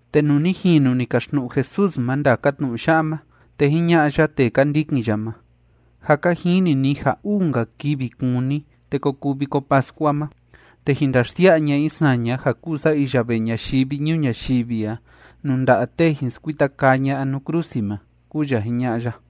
Te nuu ni jinu ni kaxtnu'u Jesús ma ndaka tnu'u ya'a ma, te jiña'a ya tee ka ndikin ya ma: ―Jâ ka jini ni ja uu‑nka kivi kúni, te ko kuu Viko Pascua ma, te jin ndaxsia'a ña'a i saña ja kúu sa iya vee ñayivi ñuu ñayivi a nuu nda'a tee jin skuita kaa ña'a nuu krusi ma ―kúu ya jiña'a ya.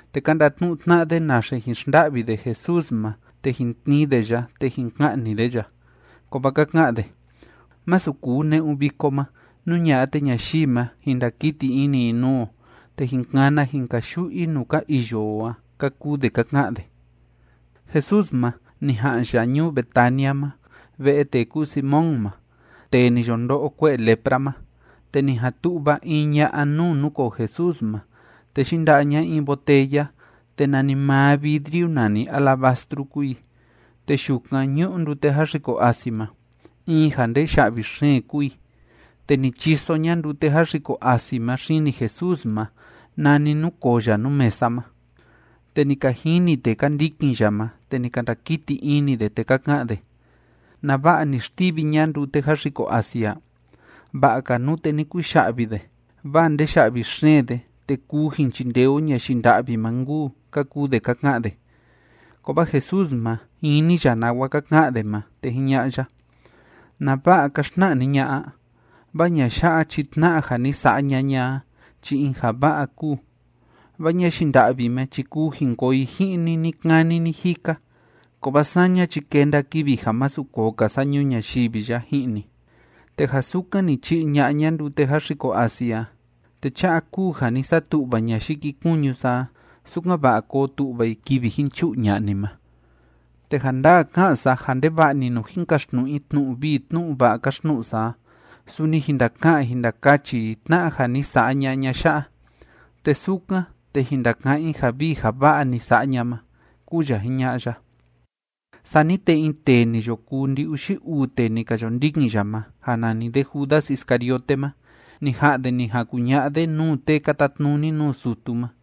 Te ka ndatnu'u tna'a de naxe jin xnda'vi de Jesús ma te jin tnii de ya te jin ka'ni de ya. Kovaa ka ka'an de: ―Masu kuu ne'un viko ma. Nú ña'a, te ñayii ma, jin ndakiti ini i nuu o, te jin kana jin kayu'u i nuu ka iyo o a ―ka kuu de ka ka'an de. Jesús ma, ni ja'an ya ñuu Betania ma, ve'e tee kúu Simón ma, tee ni yo ndo'o kue'e lepra ma. Te ni jan tu'va in ña'a nuu núkoo Jesús ma, te yinda'a ña in botella, te nanimaa vidriu nani alabastru kúu i, te yukan ñu'u ndute jáxiko asi ma. In ja ndee ya'vi xeen kúu i. Te ni chiso ña ndute jáxiko asi ma xini Jesús ma, nani núkoo ya nuu mesa ma. Te ni ka jini tee ka ndikin ya ma, te ni ka ndakiti ini de, te ka ka'an de: ―¿Nava'a ni xtivi ña ndute jáxiko asi a? Va'a‑ka nute ni kuya'vi de, vaa ndee ya'vi xeen de, te kuu jin chindee o ñayii nda'vi ma nkuu ―ka kuu de ka ka'an de. Kovaa Jesús ma, jini ya nawa ka ka'an de ma, te jiña'a ya: ―¿Nava'a ka xtna'a ni ña'a a? Vaa ña'a ya'a chi tna'a ja ni sa'a ña'a ña a chi in ja va'a kúu. Vaa ñayii nda'vi ma chi kuu jin koo i ji'in ni ni‑kani ni‑jika, kovaa saña chi kenda kivi ja masu koo‑ka sa ñuu ñayivi ya ji'in ni. Te ja sukan ni chi'i ña'a ña ndute jáxiko asi a, te cha'a kúu ja ni satu'va ña yikikuñu sa a, sukan‑va'a koo tu'va i kivi jin chu'u ña'a ni ma. Te ja ndaa ká'an sa ja ndeva'a‑ni nuu jin kaxtnu'u i tnu'u vii tnu'u va'a káxtnu'u sa a, suni jin ndaka'an jin ndakachi i tna'a ja ni sa'a ña'a ña'a ya'a, te sukan, te jin ndaka'án i ja vii ja va'a ni sa'a ña ma ―kúu ya jiña'a ya. Sani te in tee ni yo kuu ndi‑uxi uu tee ni ka yo ndikin ya ma, ja nani de Judas Iscariote ma, ni ja'an de ni jan kuña'a de nuu tee ka tatnuni nuu sutu ma,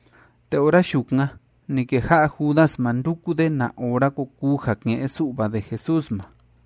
Te ora yukan ni keja'a Judas ma nduku de na ora ko kuu ja ke'en‑su'va de Jesús ma.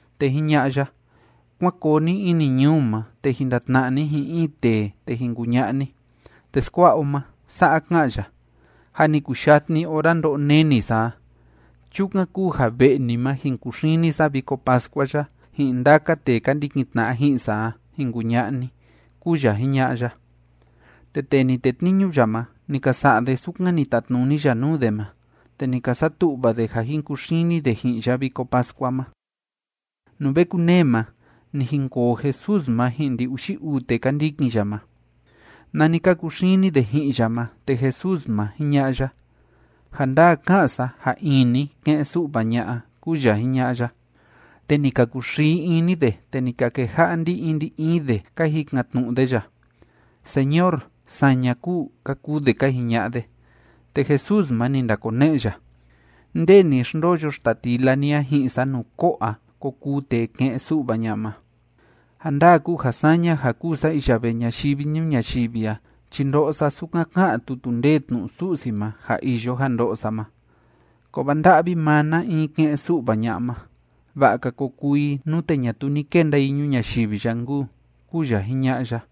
Te jiña'a ya: ―Kuán koo ni ini ñuu ma, te jin ndatna'a ni ji'in in tee, te jin kuña'a ni: “Teskua'a o ma, sa'a ká'an ya: Jâ ni kuyatni ora ndo'o neni sa a. Chukan kúu ja ve'e ni ma, jin kuxini sa Viko Pascua ya, ji'in ndaka tee ka ndikin tna'a ji'in sa a”, jin kuña'a ni ―kúu ya jiña'a ya. Te tee ni tetniñu ya ma, ni ka sa'a de sukan ni tatnuni ya nuu de ma, te ni ka satu'va de ja jin kuxini de ji'in ya Viko Pascua ma. Nuu ve kunee ma, ni jinkoo Jesús ma ji'in ndi‑uxi uu tee ka ndikin ya ma. Nani ka kuxini de ji'in ya ma, te Jesús ma, jiña'a ya: ―Ja ndaa ká'an sa ja in ni ke'en‑su'va ña'a ―kúu ya jiña'a ya. Te ni ka kuxii ini de, te ni ka keja'a ndi‑in ndi‑in de ka jikan‑tnu'u de ya: ―Señor, ¿saña kúu? ―ka kuu de ka jiña'a de. Te Jesús ma, ni ndakone'e ya: ―Nde ni xndoyo xtatila ni a ji'in sa nuu ko'o a ko kuu tee ke'en‑su'va ña'a ma. Ja ndaa kúu ja saña ja kúu sa iya vee ñayivi ñuu ñayivi a chi ndo'o sa sukan ká'an tutu ndee tnu'u Su'si ma ja iyo ja ndo'o sa ma, kovaa ¡nda'vi maa na in ke'en‑su'va ña'a ma! Va'a‑ka ko kuu i, nute ñatuu ni kenda i ñuu ñayivi ya nkuu ―kúu ya jiña'a ya.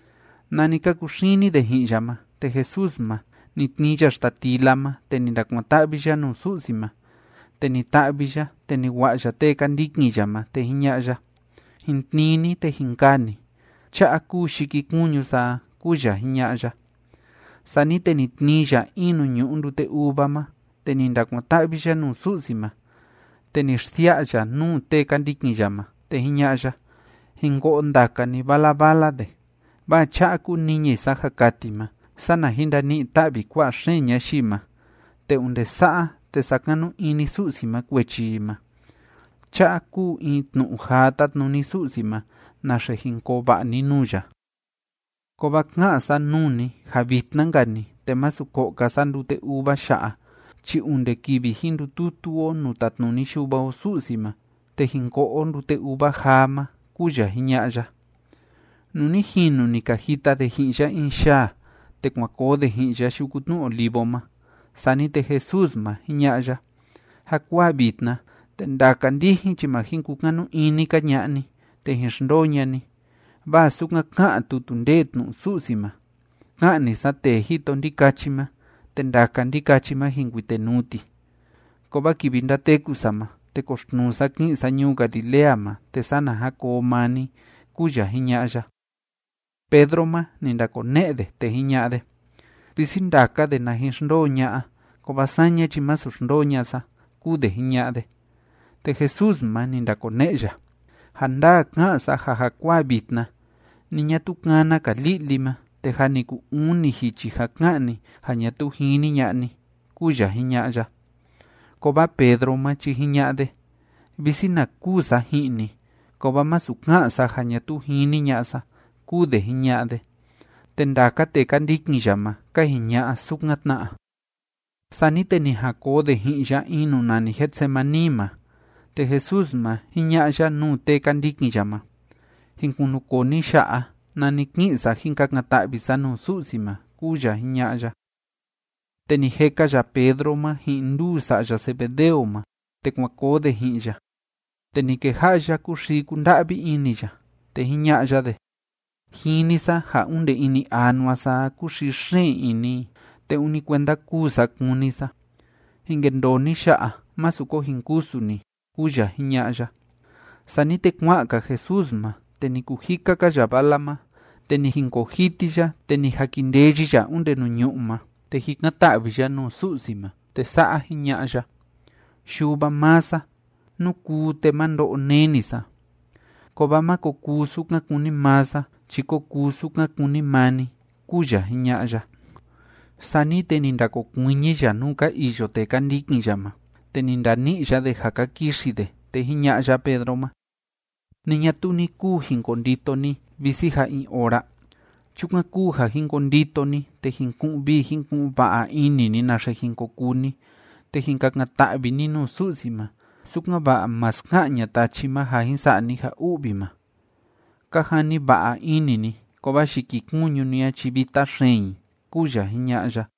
Nani ka kuxini de ji'in ya ma, te Jesús ma, ni tnii ya xtatila ma, te ni ndakuan‑ta'vi ya nuu Su'si ma, te ni ta'vi ya, te ni wa'a ya tee ka ndikin ya ma, te jiña'a ya: ―Jin tnii ni, te jin kaa ni. Cha'a kúu yikikuñu sa a ―kúu ya jiña'a ya. Sani te ni tnii ya in nuu ñu'u ndute uva ma, te ni ndakuan‑ta'vi ya nuu Su'si ma. Te ni xsia'a ya nuu tee ka ndikin ya ma, te jiña'a ya: ―Jin ko'o ndaka ni vala vala de. Vaa cha'a kúu niñi sa ja kati ma, sana jin ndani'i‑ta'vi kua'a xeen ñayii ma, te onde sa'a, te sakanu ini Su'si ma kuechi i ma. Cha'a kúu in tnu'u jaa tátnuni Su'si ma naxe jin koo va'a ni nuu ya. Kovaa ká'an sa nuu ni ja vitna‑nka‑ni, te masu ko'o‑ka sa ndute uva ya'a chi onde kivi jin ndututu o nuu tatnuni Yuva o Su'si ma te jin ko'o o ndute uva jaa ma ―kúu ya jiña'a ya. Nuu ni jinu ni ka jita de ji'in ya in yaa, te kuan koo de ji'in ya Yuku Tnu Olivo ma. Sani te Jesús ma, jiña'a ya: ―Jakuaa vitna, te ndaka ndijin chi ma jin kukanu ini‑ka ña'a ni, te jin xndoo ña'a ni, vaa sukan ká'an tutu ndee tnu'u Su'si ma: “Ka'ni sa tee jito ndikachi ma, te ndaka ndikachi ma, jin kuitenuu ti.” Kovaa kivi ndateku sa ma, te koxtnuu sa ki'in sa ñuu Galilea ma, te sana jan koo maa ni ―kúu ya jiña'a ya. Pedro ma, ni ndakone'e de, te jiña'a de: ―Visi ndaka de na jin xndoo ña'a, kovaa saña chi masu xndoo ña'a sa ―kúu de jiña'a de. Te Jesús ma, ni ndakone'e ya: ―Ja ndaa ká'an sa ja jakuaa vitna, ni ñatuu kana‑ka li'li ma, te jâ ni kuu uni jichi ja ka'an ni ja ñatuu jini ña'a ni ―kúu ya jiña'a ya. Kovaa Pedro ma chi jiña'a de: ―Visi na kûu sa ji'in ni, kovaa masu ka'an sa ja ñatuu jini ña'a sa ―kúu de jiña'a de, te ndaka tee ka ndikin ya ma ka jiña'a sukan tna. Sani te ni jan koo de ji'in ya in nuu nani Getsemaní ma, te Jesús ma, jiña'a ya nuu tee ka ndikin ya ma: ―Jin kunukoo ni ya'a, nani ki'in sa jin kakan‑ta'vi sa nuu Su'si ma ―kúu ya jiña'a ya. Te ni jeka ya Pedro ma ji'in nduu sa'ya Zebedeo ma, te kuan koo de ji'in ya, te ni keja'a ya kúxii kúnda'vi ini ya, te jiña'a ya de: ―Jini sa ja onde ini anua sa a, kúxii xeen ini i, te ûni kuenda kûu sa kúni sa. Jin kendoo ni ya'a. Másu ko jin kusu ni ―kúu ya jiña'a ya. Sani te kua'an‑ka Jesús ma, te ni kujika‑ka ya vala ma, te ni jinkoo jiti ya, te ni jakindeyi ya onde nuu ñu'ú ma, te jikan‑ta'vi ya nuu Su'si ma, te sa'a jiña'a ya: ―Yuva maa sa, nú kuu, te má ndo'o neni sa. Kovaa má ko kuu sukan kúni maa sa chi kó kuu sukan kúni maa ni ―kúu ya jiña'a ya. Sani te ni ndakokuiñi ya nuu ka iyo tee ka ndikin ya ma, te ni ndani'i ya de ja ka kixi de, te jiña'a ya Pedro ma: ―¿Ni ñatuu ni kuu jin kondito ni visi ja in ora? Chukan kúu ja jin kondito ni, te jin ku'un vii jin ku'un va'a ini ni naxe jin ko kuu ni, te jin kakan‑ta'vi ni nuu Su'si ma, sukan‑va'a má ska'an ña'a tachi ma ja jin sa'a ni ja u'vi ma. Ka jani va'a ini ni, kovaa yikikuñu ni a chi vita xeen i ―kúu ya jiña'a ya.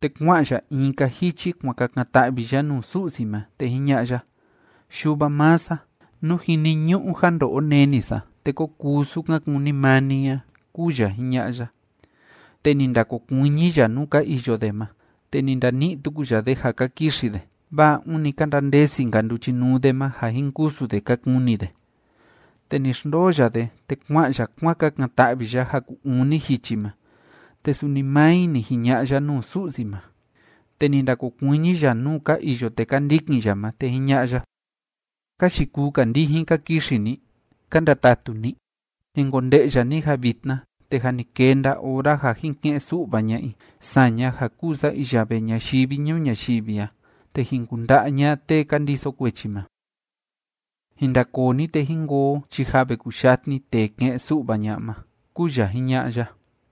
Te kua'an ya in‑ka jichi kuan kakan‑ta'vi ya nuu Su'si ma, te jiña'a ya: ―Yuva maa sa, nú jiniñu'u ja ndo'o neni sa, te kó kuu sukan kúni maa ni a ―kúu ya jiña'a ya. Te ni ndakokuiñi ya nuu ka iyo de ma, te ni ndani'i tuku ya de ja ka kixi de, vaa ûni ka ndandesi‑nka nduchinuu de ma, ja jin kusu de ka kuni de. Te ni xndoo ya de, te kua'an ya kuan kakan‑ta'vi ya ja ku‑uni jichi ma, te suni maa i ni jiña'a ya nuu Su'si ma. Te ni ndakokuiñi ya nuu ka iyo tee ka ndikin ya ma, te jiña'a ya: ―¿Ka yikuu‑ka ndijin ka kixi ni? ¿Ka ndatatu ni? Jin konde'ya ni ja vitna, te jâ ni kenda ora ja jin ke'en‑su'va ña'a i saña ja kúu sa iya vee ñayivi ñuu ñayivi a, te jin kunda'a ña'a tee ka ndiso kuechi ma. Jin ndakoo ni, te jín koo o chi jâ ve kuyatni tee ke'en‑su'va ña'a ma ―kúu ya jiña'a ya.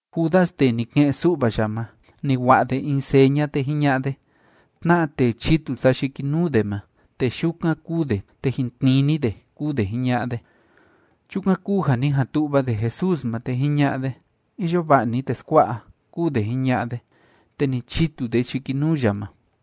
Judas tee ni ke'en‑su'va ya ma, ni wa'a de in seña, te jiña'a de: ―Tna'a tee chitu sa yikinuu de ma, tee yukan kúu de, te jin tnii ni de ―kúu de jiña'a de. Chukan kúu ja ni jan tu'va de Jesús ma, te jiña'a de: ―Iyo va'a ni, teskua'a ―kúu de jiña'a de. Te ni chitu de yikinuu ya ma.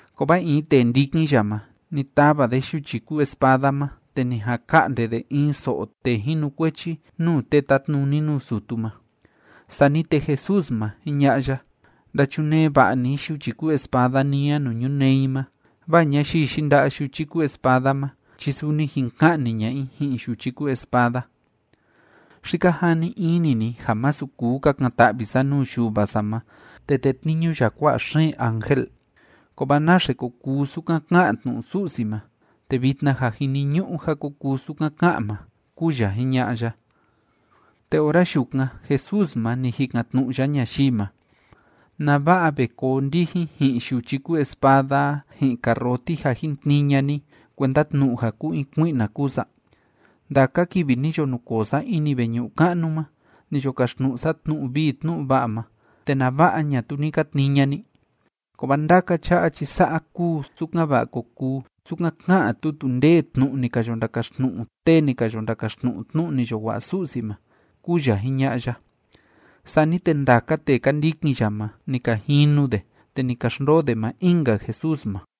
Kovaa in tee ndikin ya ma, ni tava de yuchi kúu espada ma, te ni jan ka'nde de in so'o tee jinukuechi nuu tee tátnuni nuu sutu ma. Sani te Jesús ma, jiña'a ya: ―Ndachunee va'a ni yuchi kúu espada ni a nuu ñunee i ma, vaa ñayii yinda'a yuchi kúu espada ma chi suni jin ka'ni ña'a i ji'in yuchi kúu espada. ¿Xi ka jani ini ni ja masu kuu kakan‑ta'vi sa nuu Yuva sa ma, te tetniñu ya kua'a xeen ángel? ¿Kovaa naxe ko kuu sukan ká'an tnu'u Su'si ma? Te vitna ja jiniñu'u ja ko kuu sukan ká'an ma ―kúu ya jiña'a ya. Te ora yukan, Jesús ma, ni jikan‑tnu'u ya ñayii ma: ―¿Nava'a ve koo ndijin ji'in yuchi kúu espada a ji'in karroti ja jin tnii ña'a ni, kuenda tnu'u ja kúu in kui'na kúu sa? Ndaka kivi ni yo nukoo sa ini veñu'u ka'nu ma, ni yo kaxtnu'u sa tnu'u vii tnu'u va'a ma, ¿te nava'a ñatuu ni ka tnii ña'a ni? Kovaa ndaka cha'a chi sa'a kúu sukan‑va'a ko kuu sukan ká'an tutu ndee tnu'u ni ka yo ndakaxtnu'u tee ni ka yo ndakaxtnu'u tnu'u ni yo wa'a Su'si ma ―kúu ya jiña'a ya. Sani te ndaka tee ka ndikin ya ma, ni ka jinu de, te ni ka xndoo de maa in‑nka Jesús ma.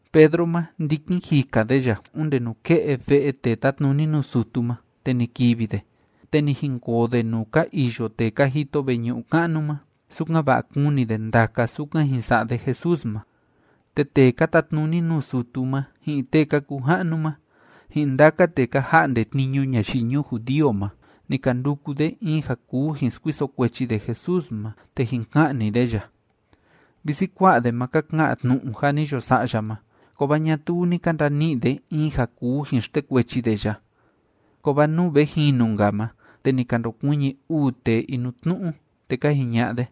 Pedro ma, ndikin jika de ya onde nuke'e ve'e tee tátnuni nuu sutu ma, te ni kivi de, te ni jinkoo de nuu ka iyo tee ka jito veñu'u ka'nu ma, sukan‑va'a kuni de ndaka sukan jin sa'a de Jesús ma. Te tee ka tatnuni nuu sutu ma, ji'in tee ka kuu ja'nu ma, ji'in ndaka tee ka ja'nde tniñu ñayii ñuu judío ma, ni ka nduku de in ja kuu jin skuiso kuechi de Jesús ma te jin ka'ni de ya. Visi kua'a de ma ka ka'an tnu'u ja ni yo sa'a ya ma, kovaa ñatuu ni ka ndani'i de in ja kuu jin xtekuechi de ya. Kovaa nuu ve jinu‑nka ma, te ni ka ndokuiñi uu tee inutnu'u, te ka jiña'a de: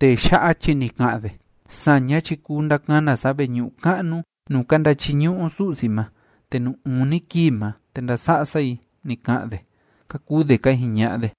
―Tee ya'a chi ni ka'an de: “Saña chi kuu ndakana sa veñu'u ka'nu nuu ka ndachiñu'u o Su'si ma, te nuu uni kii ma, te ndasa'a sa i”, ni ka'an de ―ka kuu de ka jiña'a de.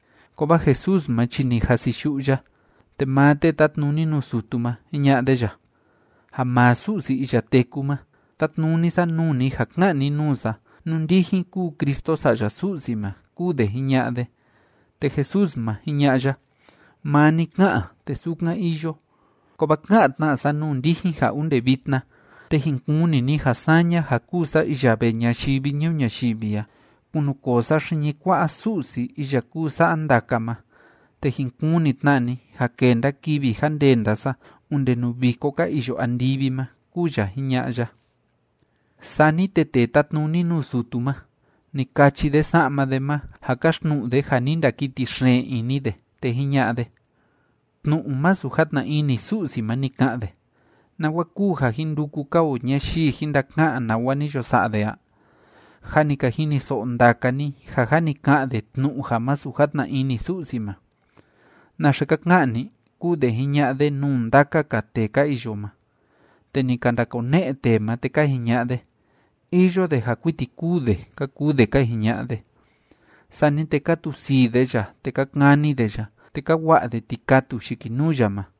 Kovaa Jesús ma chi ni jasiyu'u ya. Te maa tee tátnuni nuu sutu ma, jiña'a de ya: ―Ja maa Su'si iya téku ma, tátnuni sa nuu ni ja ka'an ni nuu sa nú ndijin kúu Cristo Sa'ya Su'si ma ―kúu de jiña'a de. Te Jesús ma, jiña'a ya: ―Maa ni ká'an, te sukan iyo. Kovaa ká'an tna sa nuu ndijin ja onde vitna, te jin kuni ni ja saña ja kúu sa iya vee ñayivi ñuu ñayivi a, kunukoo sa xiñi kua'a Su'si iya kúu sa'a ndaka ma, te jin kuni tna ni ja kenda kivi ja ndenda sa onde nuu viko ka iyo andivi ma ―kúu ya jiña'a ya. Sani te tee tátnuni nuu sutu ma, ni kachi de sa'ma de ma, ja káxtnu'u de ja ni ndakiti xeen ini de, te jiña'a de: ―¡Tnu'u masu játna ini Su'si ma ni ka'an de! ¿Nawa kúu ja jin nduku‑ka o ñayii jin ndaka'an nawa ni yo sa'a de a? Jâ ni ka jiniso'o ndaka ni ja jâ ni ka'an de tnu'u ja masu játna ini Su'si ma. ¿Naxe ka ka'an ni? ―kúu de jiña'a de nuu ndaka‑ka tee ka iyo ma. Te ni ka ndakone'e tee ma, te ka jiña'a de: ―Iyo de ja kuiti kûu de ―ka kuu de ka jiña'a de. Sani te ka tusii de ya, te ka kani de ya, te ka wa'a de tikatu yikinuu ya ma,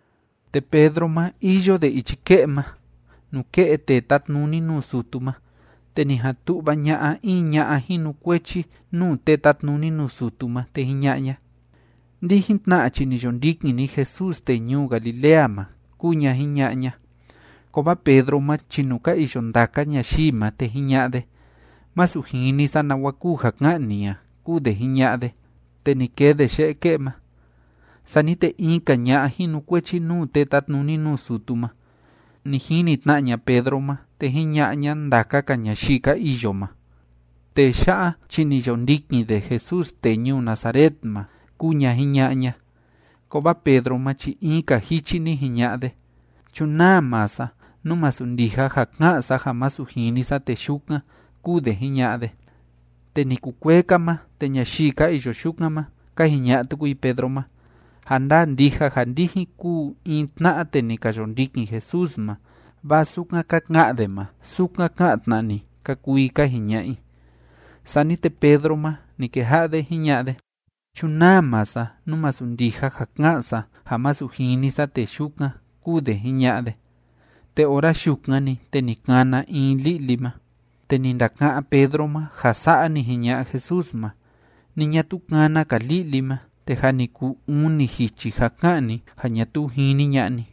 Te Pedro ma, iyo de ichi ke'e ma, nuke'e tee tátnuni nuu sutu ma. Te ni jan tu'va ña'a in ña'a jinukuechi nuu tee tátnuni nuu sutu ma, te jiña'a ña: ―Ndijin tna chi ni yo ndikin ni Jesús tee ñuu Galilea ma ―kúu ña jiña'a ña. Kovaa Pedro ma chi nuu ka iyo ndaka ñayii ma, te jiña'a de: ―Masu jini sa nawa kúu ja ká'an ni a ―kúu de jiña'a de. Te ni kee de ye'e ke'e ma. Sani te in‑ka ña'a jinukuechi nuu tee tátnuni nuu sutu ma, ni jini tna ña Pedro ma, te jiña'a ña ndaka‑ka ñayii ka iyo ma: ―Tee ya'a chi ni yo ndikin de Jesús tee ñuu Nazaret ma ―kúu ña jiña'a ña. Kovaa Pedro ma chi in‑ka jichi ni jiña'a de: ―Chunaa maa sa, nú masu ndija ja ká'an sa ja masu jini sa tee yukan ―kúu de jiña'a de. Te ni kukuee‑ka ma, te ñayii ka iyo yukan ma, ka jiña'a tuku i Pedro ma: ―Ja ndaa ndija ja ndijin kúu in tna'a tee ni ka yo ndikin Jesús ma, vaa sukan ka ka'an de ma, sukan ká'an tna ni ―ka kuu i ka jiña'a i. Sani te Pedro ma, ni keja'a de jiña'a de: ―Chunaa maa sa, nú masu ndija ja ká'an sa ja masu jini sa tee yukan ―kúu de jiña'a de. Te ora yukan‑ni, te ni kana in li'li ma. Te ni ndaka'án Pedro ma ja sa'a ni jiña'a Jesús ma: “Ni ñatuu kana‑ka li'li ma, te jâ ni kuu uni jichi ja ka'an ni ja ñatuu jini ña'a ni.”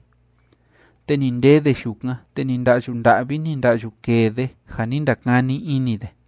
Te ni ndee de yukan, te ni nda'yu nda'vi, ni nda'yu kee de, ja ni ndakani ini de.